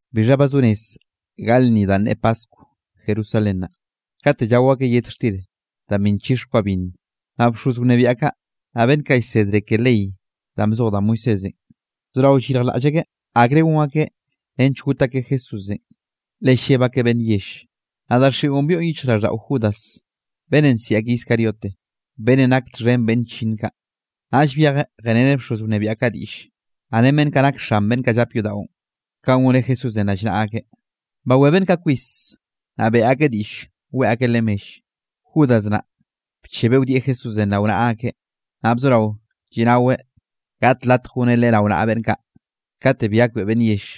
Bixha ba zo rez gaꞌl lnni danꞌ ne paskw Jerusalén naꞌ, katenꞌ llao akeꞌ yet xtir danꞌ bi nchix kwa binn. Naꞌ bxoz wnebiaꞌ kaꞌ, naꞌ beꞌnn kaꞌ llsedre ke ley danꞌ bzoj da Moisésenꞌ, bzorao llyirjlaꞌll akeꞌ akre gon akeꞌ nench got akeꞌ Jesúsenꞌ, le lleb akeꞌ beꞌnn yell. Naꞌ daxiꞌon byoꞌn yichjraꞌlldaꞌo Judas, beꞌnnenꞌ nsiꞌi akeꞌ Iscariote, beꞌnnenꞌ nak txhen beꞌnn chllinn kaꞌ. Naꞌll byejeꞌ jeꞌreneꞌ bxoz wnebiaꞌ kaꞌ diꞌlle, naꞌ ren beꞌnn kaꞌ nak xan beꞌnn kaꞌ llap yodaꞌon, kanꞌ goneꞌ Jesúsenꞌ rallnaꞌa akeꞌ. Bawé beꞌnn kaꞌ kwis, naꞌ beꞌe akeꞌ diꞌll weꞌe akeꞌ leꞌe mell. Judas naꞌ bchebeꞌ wdieꞌ Jesúsenꞌ rao naꞌa akeꞌ, naꞌ bzorao lliꞌnaweꞌ gaꞌt latj goneꞌ Leꞌe rao naꞌa beꞌnn kaꞌ, kate bi gakbeꞌe beꞌnn yell.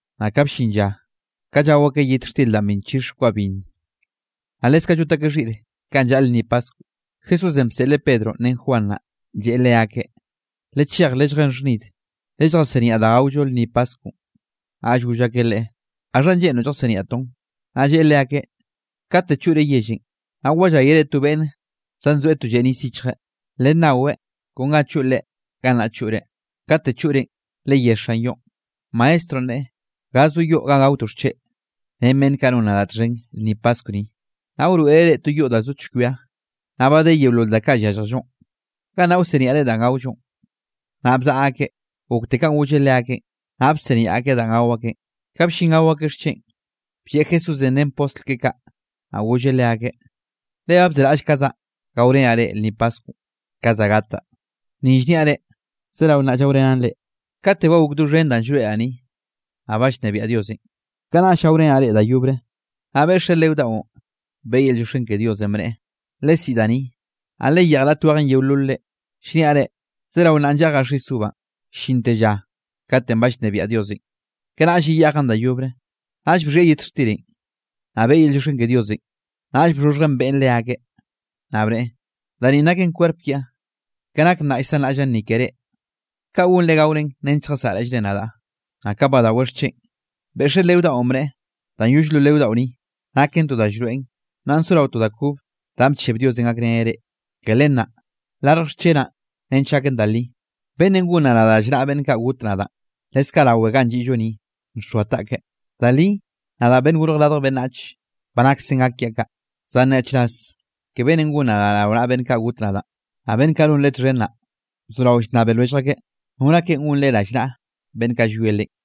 Naꞌ ka bllin lla, ka llao akeꞌ yet xtir danꞌ bi nchix kwa binn, naꞌ leskaꞌ llot akeꞌ xhiꞌr kanꞌ llaꞌl lnni Paskw. Jesúsenꞌ bseꞌleꞌ Pedronꞌ ren Juan naꞌ, lleꞌe leakeꞌ: —Lechej lelljén xhnid, lelljasiniaꞌ danꞌ gaollo lnni paskwnꞌ. Naꞌll goll akeꞌ Leꞌe: —¿Gaxha lleꞌnroꞌ lljasiniaꞌtoꞌn? Naꞌ lleꞌe leakeꞌ: —Kate choꞌre yellenꞌ, naꞌ walláyere to beꞌnne zanzoeꞌ to lleꞌ nis xhichjeꞌ, lennaweꞌ, kon ga choꞌ leꞌe, gannaꞌ choꞌre. Kate choꞌrenꞌ, leyé xan yoꞌn: “Maestronꞌ, neꞌe: ¿Ga zo yoꞌ ganꞌ gaotoꞌ xcheꞌ, ren beꞌnn kaꞌ non nadaꞌ txhen lnni paskw ni?” Naꞌ wroeꞌreꞌ reꞌ to yoꞌ da zo chkwia, naꞌ ba de yeolol da kaꞌ yálljellonꞌ, gannaꞌ wsiniaꞌre danꞌ gaollonꞌ. Naꞌ bzaꞌa akeꞌ, gokte kanꞌ golleꞌ leakeꞌn, naꞌ bsiniaꞌ akeꞌ danꞌ gao akeꞌn. Ka bllin gao akeꞌ xcheꞌn, blleꞌ Jesúsenꞌ ren postl keꞌe kaꞌ. Naꞌ golleꞌ leakeꞌ: —¡Le ba bzeraꞌllkazaꞌ gaorenaꞌ reꞌ, lnni paskwnꞌ ka za gataꞌ! Ni llniaꞌ reꞌ, zerao nnaꞌ llaorenaꞌn reꞌ. Kate ba gok doxhen danꞌ llroeꞌraꞌ ni, naꞌ ba llnebiaꞌ Diosenꞌ, kanaꞌll gaorenaꞌ reꞌ da yobre. Naꞌ beꞌxeꞌ leo daꞌon, beꞌe yel llioxken ke Dios, bneꞌe: —Lesiꞌi da ni, naꞌ leyeꞌj raꞌt wejen yeololre. Llniaꞌ reꞌ, zerao nnaꞌ lleꞌjaꞌ xis uvanꞌ, llinte lla kate ba llnebiaꞌ Diosenꞌ; kanaꞌll yeyeꞌjaꞌn da yobre. Naꞌll bxhieꞌ yet xtirenꞌ, naꞌ beꞌe yel llioxken ke Diosenꞌ, naꞌll bxhoxhjeꞌn beꞌen leakeꞌ, naꞌ bneꞌe: —Da ninꞌ naken kwerp kiaꞌ, ke nak nnaꞌ llsanraꞌllaꞌn ni ke reꞌ, kaꞌ gonre gaoren nench lljasaꞌraꞌllre nadaꞌ. Naꞌ ka badaweꞌ xcheꞌn, beꞌxeꞌ leo daꞌon bneꞌe: —Danꞌ yoll lo leo daꞌo ni, naken to da llroeꞌn, nnaꞌ sorao to da kob, danꞌ bcheb Diosenꞌ gakreneꞌ reꞌ, ke len naꞌ, larj xchenaꞌn nench gaken da li. Beꞌnnenꞌ gon nadaꞌ rallnaꞌa beꞌnn kaꞌ got nadaꞌ, leskaꞌ rawe ganꞌ lliꞌllo ni, nxoa taꞌkeꞌ. Da li, nadaꞌ, Beꞌnnenꞌ Gorj Radj Beꞌnnach, ba naksen gak kiaꞌ kaꞌ, zan nyaꞌchraz ke beꞌnnenꞌ gon nadaꞌ rao naꞌa beꞌnn kaꞌ got nadaꞌn. Naꞌ beꞌnn kaꞌ non Leꞌe txhen naꞌ, bzorao llnnabe lwellj akeꞌ, nor akeꞌn gon Leꞌe rallnaꞌa beꞌnn kaꞌ llwie Leꞌen.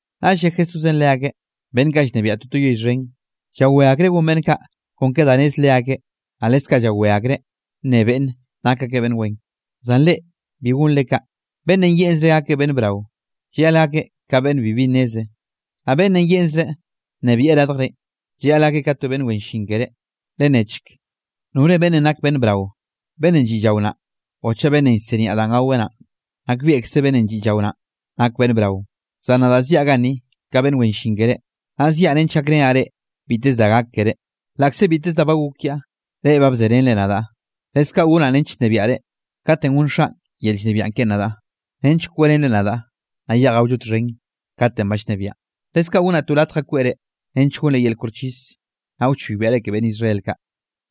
Naꞌll lle Jesúsenꞌ leakeꞌ: —Beꞌnn kaꞌ llnebiaꞌ toto yell xhen, llawé akreꞌ gon beꞌnn kaꞌ kon da nez leakeꞌ, naꞌ leskaꞌ llawé akreꞌ nne beꞌnne, nak akeꞌ beꞌnn wen. Zan reꞌ, bi gonre kaꞌ, beꞌnnenꞌ yeꞌnzreꞌ gakeꞌ beꞌnn brao, llayaꞌl gakeꞌ ka beꞌnn bibi nneze, naꞌ beꞌnnenꞌ yeꞌnzreꞌ nnebieꞌ radjrenꞌ, llayaꞌl gakeꞌ ka to beꞌnn wen llin keré. Lennechk, ¿nore beꞌnnenꞌ nak beꞌnn brao, beꞌnnenꞌ lliꞌ llao naꞌ, o chaꞌ beꞌnnenꞌ llsiniaꞌ danꞌ gaweꞌ naꞌn? Nakbieꞌkze beꞌnnenꞌ lliꞌ llao naꞌ, nak beꞌnn brao. Zan nadaꞌ ziaꞌ ganni ka beꞌnn wen llin keré, naꞌ ziaꞌ nench gakrenaꞌ reꞌ biteze da gak keré. ’Laꞌkze biteze da ba gok kiaꞌ, reꞌ ba bzerenre nadaꞌ. Leskaꞌ gonaꞌ nench nnebiaꞌre katenꞌ gonn Xaꞌn yel llnebiaꞌ keꞌen nadaꞌ, nench kweꞌrenre nadaꞌ, naꞌ yeꞌj gaollo txhen katenꞌ ba llnebiaꞌn, leskaꞌ gonaꞌ to latj ga kweꞌre nench gonre yel koxchis, naꞌ wchoybiaꞌre ke beꞌnn Israel kaꞌ.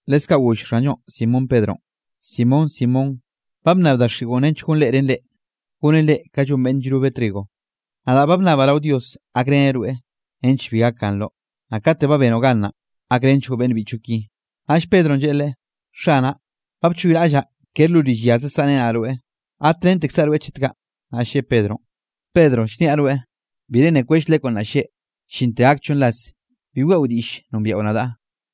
Leskaꞌ goll Xanllonꞌ Simón Pedronꞌ: —Simón, Simón ba bnnab daxiꞌon nench gonreꞌren reꞌ, gonen reꞌ ka llon beꞌnn llrobe trigo. Nadaꞌ ba bnnabaꞌ rao Dios gakreneꞌ rweꞌ nench bi gakganroꞌ, naꞌ kate ba benoꞌ gan naꞌ, gakrenchgoꞌ beꞌnn biꞌchoꞌ ki. Naꞌll Pedronꞌ lleꞌe Leꞌe: —Xanaꞌ, ba bchoyraꞌllaꞌ kere lo rill yaze saꞌrenaꞌ rweꞌ, gatrentekzaꞌ rweꞌ chet kaꞌ. Naꞌll lleꞌe Pedronꞌ: —Pedro, llniaꞌ rweꞌ, bire nne kwell lekwnꞌ nnaꞌ lleꞌ, llinte gak chonn ras bi weꞌo diꞌll nombiaꞌo nadaꞌ.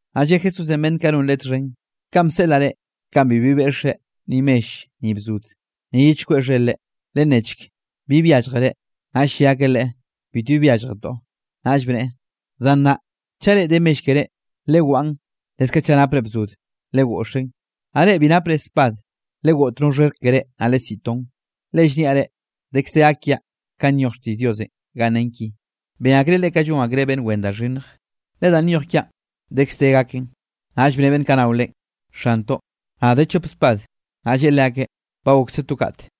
Naꞌ lle Jesúsenꞌ beꞌnn kaꞌ non Leꞌe txhen: —Kanꞌ bseꞌlaꞌ reꞌ, kaꞌn bibi beꞌxkzre, ni mell, ni bzod, ni ye chkweꞌ xher-re; lennechk, ¿bi byálljere? Naꞌ lle akeꞌ Leꞌe: —Bitbi byálljetoꞌ. Naꞌll bneꞌe: —Zan nnaꞌ, chaꞌ reꞌ de mell keré, lewaꞌn; leskaꞌ chaꞌ napre bzod, legoꞌxen; naꞌ reꞌ bi napre spad, legoꞌt no xherk keré, naꞌ lesiꞌi ton. Le llniaꞌ reꞌ, dekz de gak kiaꞌ kanꞌ nyoj xtiꞌll Diosenꞌ ganꞌ nen ki: “Ben akreꞌ leꞌe ka llon akreꞌ beꞌnn wen da xhinnj.” Le danꞌ nyoj gak kiaꞌn dekz de gaken. Naꞌll bne beꞌnn kaꞌ nao Leꞌen: —Xantoꞌ, naꞌ de chop spad. Naꞌ lleꞌe leakeꞌ: —Ba gokse to kate.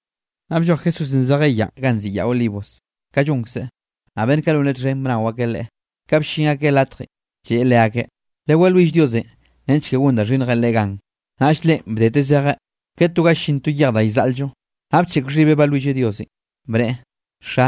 Naꞌ blloj Jesúsenꞌ zejeꞌ yaꞌn ganꞌ nziꞌi Yaꞌ Olivos, ka llonkzeꞌ, naꞌ beꞌnn kaꞌ non Leꞌe txhen bnao akeꞌ Leꞌe. Ka bllin akeꞌ latjenꞌ, lleꞌe leakeꞌ: —Lewalwill Diosenꞌ nench ke gon da xhinnjenꞌ reꞌ gan. Naꞌll Leꞌen bdeteꞌ zejeꞌ, ke to ga llin to yej da llzaꞌl-llo, naꞌ bcheꞌk xhibeꞌ balwilleꞌ Diosenꞌ, bneꞌe: —Xa,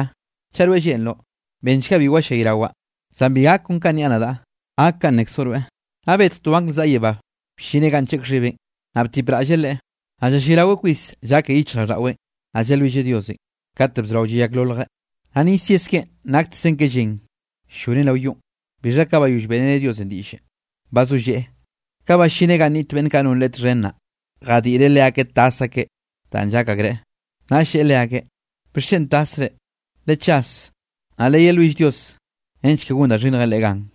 chaꞌ rweꞌ lleꞌnroꞌ, benchga bi wallayrawaꞌ, zan bi gak kon ka nniaꞌ nadaꞌ, gak kanꞌ nnekzoꞌ rweꞌ. Naꞌ betj to angl zaꞌa yebánꞌ bllineꞌ ganꞌ ncheꞌk xhibeꞌn, naꞌ btipraꞌlle Leꞌe. Naꞌ llallayraweꞌ kwis llake yichjraꞌlldaꞌweꞌn, naꞌ llalwilleꞌ Diosenꞌ, kate bzorao llayakloljeꞌ, naꞌ nis yes keꞌen naktekzen llen ll-llonen rao yonꞌ. Bixha ka bayoll beꞌreneꞌ Diosenꞌ diꞌllenꞌ, bazolleꞌe. Ka ballineꞌ ganꞌ niꞌt beꞌnn kaꞌ non Leꞌe txhen naꞌ, jadiꞌreꞌ leakeꞌ tas akeꞌ danꞌ llak akreꞌ. Naꞌll lleꞌe leakeꞌ: —¿Bixchen tasre? Lechas, naꞌ lewalwill Dios nench ke gon da xhinnjenꞌ reꞌ gan.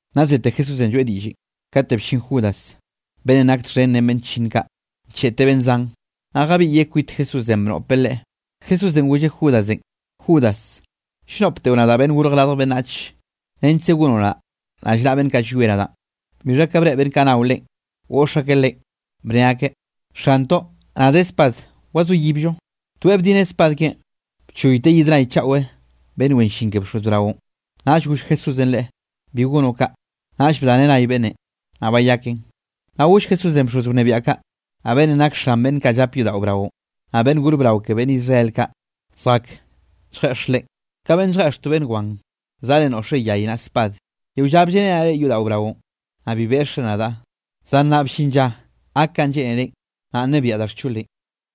Naꞌ zete Jesúsenꞌ lloeꞌ diꞌllenꞌ, kate bllin Judas beꞌnnenꞌ nak txhen ren beꞌnn chllinn kaꞌ, ncheꞌteꞌ beꞌnn zan, naꞌ jabiꞌyeꞌ kwit Jesúsenꞌ bnoꞌpeꞌ Leꞌe. Jesúsenꞌ golleꞌ Judasenꞌ: —Judas, ¿llnoꞌpteꞌo nadaꞌ, Beꞌnnenꞌ Gorj Radj Beꞌnnach, nechkze gonoꞌ nadaꞌ rallnaꞌa beꞌnn kaꞌ llwie nadaꞌn? Bixha ka breꞌe beꞌnn kaꞌ nao Leꞌen, goꞌx akeꞌ Leꞌen, bne akeꞌ: —Xantoꞌ, naꞌ de spad, ¿wzoyibllo? Toeꞌ bdineꞌ spad keꞌen, bchoyteꞌ yid nay chaꞌwe beꞌnn wen llin ke bxoz braonꞌ. Naꞌ goll Jesúsenꞌ leꞌe: —Bi gonoꞌ kaꞌ. Naꞌll bdaneꞌ nay beꞌnnenꞌ, naꞌ bayakeꞌn. Naꞌll goll Jesúsenꞌ bxoz wnebiaꞌ kaꞌ, naꞌ beꞌnnenꞌ nak xan beꞌnn kaꞌ llap yodaꞌo braonꞌ, naꞌ beꞌnn gor brao ke beꞌnn Israel kaꞌ, zjake lljeꞌx Leꞌen: —Ka beꞌnn lljeꞌx to beꞌnn wan, zaꞌre noꞌxre yay naꞌ spad. Yeo lla blleꞌrenaꞌ reꞌ yodaꞌo braonꞌ, naꞌ bi beꞌxre nadaꞌ, zan nnaꞌ bllin lla gak kanꞌ lleꞌnerenꞌ, nnaꞌ nnebiaꞌ da xcholenꞌ.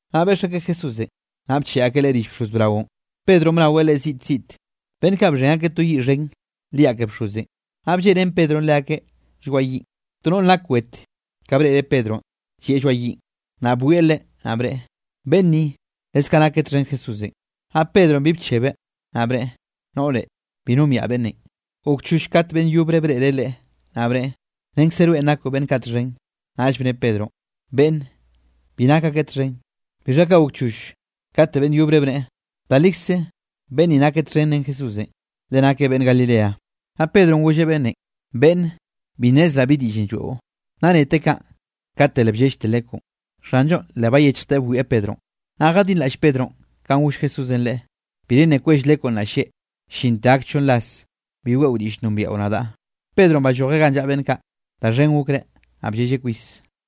Naꞌ beꞌx akeꞌ Jesúsenꞌ, naꞌ bcheꞌe akeꞌ Leꞌe rill bxoz braonꞌ, Pedronꞌ bnaweꞌ Leꞌe ziꞌt ziꞌt. Beꞌnn kaꞌ bxhen akeꞌ to yiꞌ xhen liaꞌ ke bxozenꞌ, naꞌ blleꞌrén Pedronꞌ leakeꞌ lloaꞌ yiꞌn. To noꞌr nak wete, ka breꞌreꞌ Pedronꞌ llieꞌ lloaꞌ yiꞌn, naꞌ bwieꞌ leꞌe, naꞌ bneꞌe: —Beꞌnn ni leskaꞌ nakeꞌ txhen Jesúsenꞌ. Naꞌ Pedronꞌ bi bchebeꞌ, naꞌ bneꞌe: —Noꞌre, bi nombiaꞌ beꞌnnenꞌ. Gok choll kate beꞌnn yobre breꞌreꞌ leꞌe, naꞌ bneꞌe: —Renkze rweꞌn nakoꞌ beꞌnn kaꞌ txhen. Naꞌll bne Pedronꞌ: —Beꞌnne, bi nak akeꞌ txhen. Bixha ka gok choll kate beꞌnn yobre bneꞌe: —Da likze, beꞌnn ninꞌ nakeꞌ txhen ren Jesúsenꞌ, le nakeꞌ beꞌnn Galilea. Naꞌ Pedronꞌ golleꞌ beꞌnnenꞌ: —Beꞌnne, bi nnezraꞌ bi diꞌllenꞌ lloeꞌo. Naꞌ neteꞌ kaꞌn, kate le bllellte lekwnꞌ. Xanllonꞌ le bayechjteꞌ bwieꞌ Pedronꞌ, naꞌ jadinraꞌll Pedronꞌ kanꞌ goll Jesúsenꞌ leꞌe: “Bire nne kwell lekwnꞌ nnaꞌ lleꞌ, llinte gak chonn ras, bi weꞌo diꞌll nombiaꞌo nadaꞌ.” Pedronꞌ ballojeꞌ ganꞌ llaꞌa beꞌnn kaꞌ, da xhen gokreꞌ, naꞌ bllelleꞌ kwis.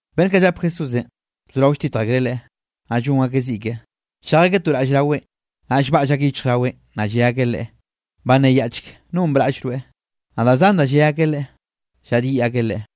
Beꞌnn kaꞌ llap Jesúsenꞌ, bzorao lltitj akreꞌ Leꞌe, naꞌ llon akeꞌ ziꞌ keꞌe. Bchej akeꞌ to raꞌll raweꞌn, naꞌ llbaꞌll akeꞌ yichjraweꞌn, naꞌ lle akeꞌ Leꞌe: —Banneyaꞌchk, ¿nonꞌ braꞌll rweꞌ? Naꞌ da zan da lle akeꞌ Leꞌe, llaꞌdyiꞌ akeꞌ Leꞌe.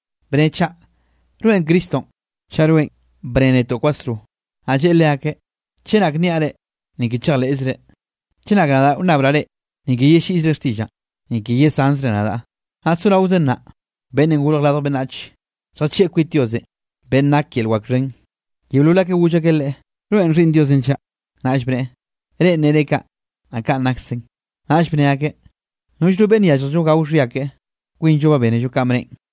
—Bne chaꞌ, ¿rweꞌn Cristonꞌ? Chaꞌ rweꞌn, bne netoꞌ kwasro. Naꞌ lleꞌe leakeꞌ: —Chenak nniaꞌ reꞌ, ni ke chejleꞌzre. Chenak nadaꞌ wnnabraꞌ reꞌ, ni ke yelliꞌzre xtiꞌllaꞌn, ni ke yesanzre nadaꞌ. Naꞌ soraozen nnaꞌ, Beꞌnnenꞌ Gorj Radj Beꞌnnach lljachieꞌ kwit Diosenꞌ, beꞌnn nak yel wak xhen. Yeolol akeꞌ goll akeꞌ Leꞌe: —¿Rweꞌn Xhiꞌnn Diosenꞌ chaꞌ? Naꞌll bneꞌe: —Reꞌn nere kaꞌ, naꞌ kaꞌn naksen. Naꞌll bne akeꞌ: —Nollno beꞌnn yálljello gao xhia keꞌe; kwinllo ba bénello kanꞌ bneꞌen.